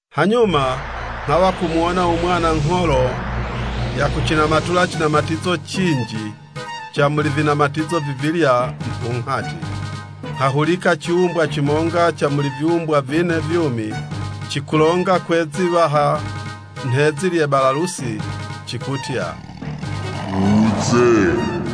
Hanyuma nghawa kumuwona u Mwana we ngholo yakucinamatula cinamatizo cinji ca muli vinamatizo vivilya mupunghati. Nghahulika ciwumbwa cimonga ca muli viwumbwa vine vyumi, cikulonga kwe'zi 'waha nhe'zi lye 'balalusi cikutya, “Wuze!”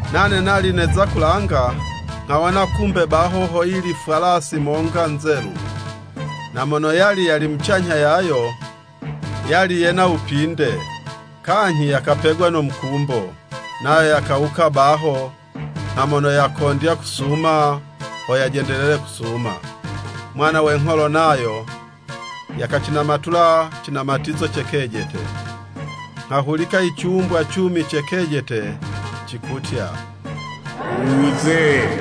Nane nali neza kulanga, nghawona kumbe baho hoyili fwalasi monga nzelu. Na mono yali yali mucanyha yayo, yali yena wupinde, kanyhi yakapegwa no mukumbo. Nayo yakawuka baho nha mono yakondya kusuma, ho yajendelele kusuma. Mwana we ngholo nayo yakacinamatula cinamatizo ce kejete. Nghahulika i ciwumbwa cumi ce kejete cikutya, “Wuze!”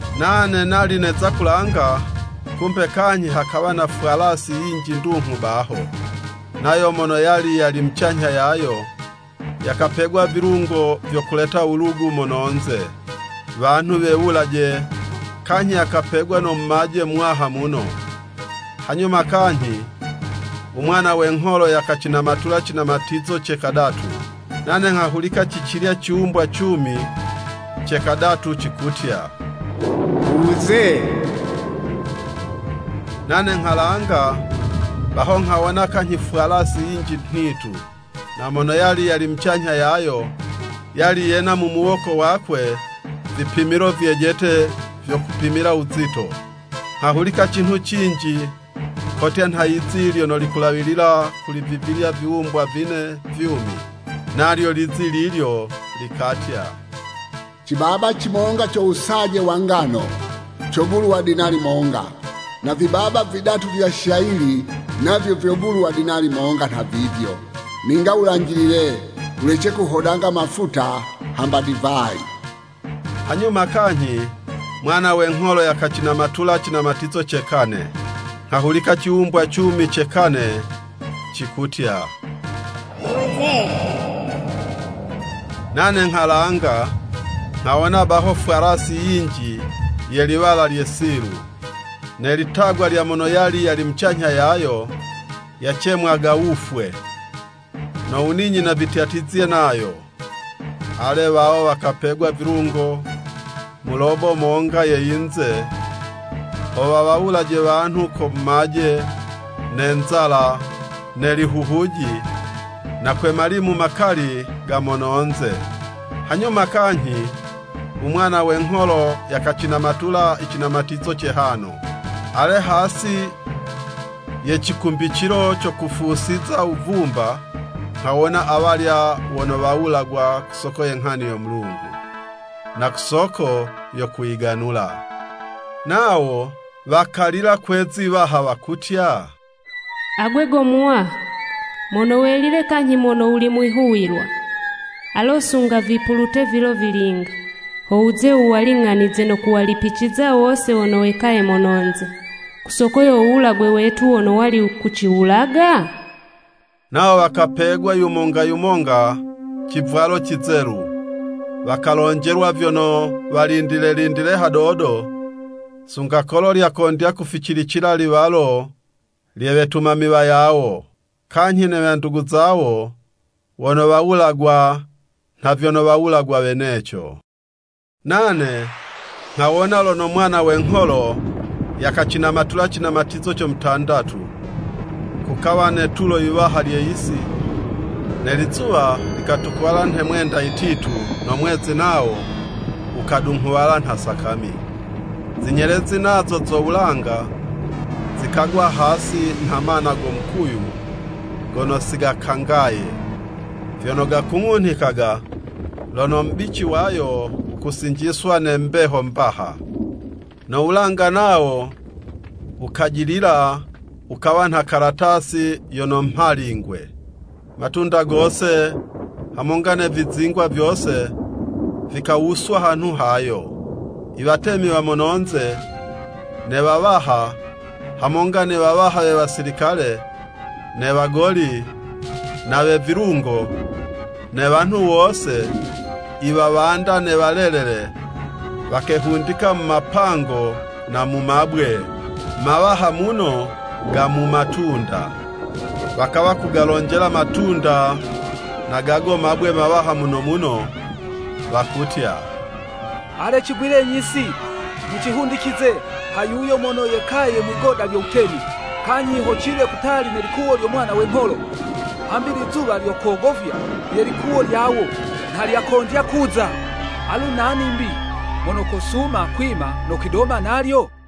Nane nali neza kulanga, kumbe kanyhi hakawa na fwalasi yinji ndunghu baho. Nayo mono yali yali mucanyha yayo, yakapegwa vilungo vyo kuleta wulugu mono'nze, wanhu wewulaje, kanyhi yakapegwa no mumaje muwaha muno. Hanyuma kanyhi u Mwana we ngholo yakacinamatula cinamatizo ce kadatu. Nane nghahulika ci cilya ciwumbwa cumi ce kadatu cikutya, “Wuze!” Nane nghalanga, baho nghawona kanyhi fwalasi yinji nhitu. Na mono yali yali mucanyha yayo, yali yena mu muwoko wakwe vipimilo vyejete vyo kupimila wuzito. Nghahulika cinhu cinji kotya nha yizi lyono likulawilila kuli vivilya viwumbwa vine vyumi. Nalyo lizi lilyo likatya, “Cibaba cimonga ca wusaje wa ngano, cogulwa dinali monga, na vibaba vidatu vya shayili, navyo vyogulwa dinali monga nhavivyo. Ninga wulanjilile, wulece kuhodanga mafuta hamba divayi!” Hanyuma kanyhi Mwana we ngholo yakacinamatula cinamatizo ce we kane. Nghahulika ciwumbwa cumi ce kane cikutya “Wuze!” Nane nghalanga, nghawona baho fwalasi yinji ye liwala lye silu. Ne litagwa lya mono yali yali mucanyha yayo, yacemwaga Wufwe, no Wuninyina vityatizye nayo. Ale, wawo wakapegwa vilungo mu lobo monga ye yinze ho wawawulaje wanhu ko mumaje, ne nzala, ne lihuhuji, na kwe malimu makali ga mono'nze. Hanyuma kanyhi u Mwana we ngholo yakacinamatula i cinamatizo ce hano. Ale, hasi ye cikumbicilo co kufusiza wuvumba, nghawona awalya wono wawulagwa ku soko ye nghani yo Mulungu, na ku soko yo kuyiganula. Nawo wakalila kwe'zi 'waha wakutya, “Agwe go Muwaha, mono welile kanyhi mono wuli mwihuwilwa, alo sunga vipulute vilo vilinga, ho wuze wuwaling'anize no kuwalipiciza wose wono wekaye mono'nze, ku soko yo wuwulagwe wetu wono wali kuciwulaga?” Nawo wakapegwa yumonga yumonga civwalo cizelu, wakalonjelwa vyono walindile lindile hadodo, sunga kolo lyakondya kuficilicila i liwalo lye wetumami wayawo, kanyhi ne wandugu zawo wono wowulagwa nha vyono wawulagwa weneco. Nane nghawona lono Mwana we ngholo yakacinamatula cinamatizo co mutandatu, kukawa ne'tulo yiwaha lye yisi, ne lizuwa likatukuwala nhe mwenda yititu no mwezi nawo, wukadunghuwala nha sakami. Zinyelezi nazo zo wulanga, zikagwa hasi nha mana go mukuyu gono si gakangaye, vyono gakung'unhikaga lono mubici wayo wukusinjiswa ne mbeho mbaha. No wulanga nawo wukajilila, wukawa nha kalatasi yono mhalingwe. Matunda gose hamonga ne vizingwa vyose, vikawuswa hanhu hayo. I watemi wa mono'nze, ne wawaha, hamonga ne wawaha we wasilikale, ne wagoli, na we vilungo, ne wanhu wose, i wawanda ne walelele wakehundika mu mapango na mu mabwe mawaha muno ga mumatunda. Wakawa kugalonjela matunda na gago mabwe mawaha muno muno wakutya, “Ale, cigwilenyi si, mucihundicize ha yuyo mono yekaye mwigoda lyo wutemi, kanyhi ho ciwe kutali ne likuwo lyo Mwana we ngholo! Hambi lizuwa lyo kogofya, lye likuwo lyawo, nha lyakondya kuza. Alu nani 'mbi mono kosuma kwima no kwidoma nalyo?”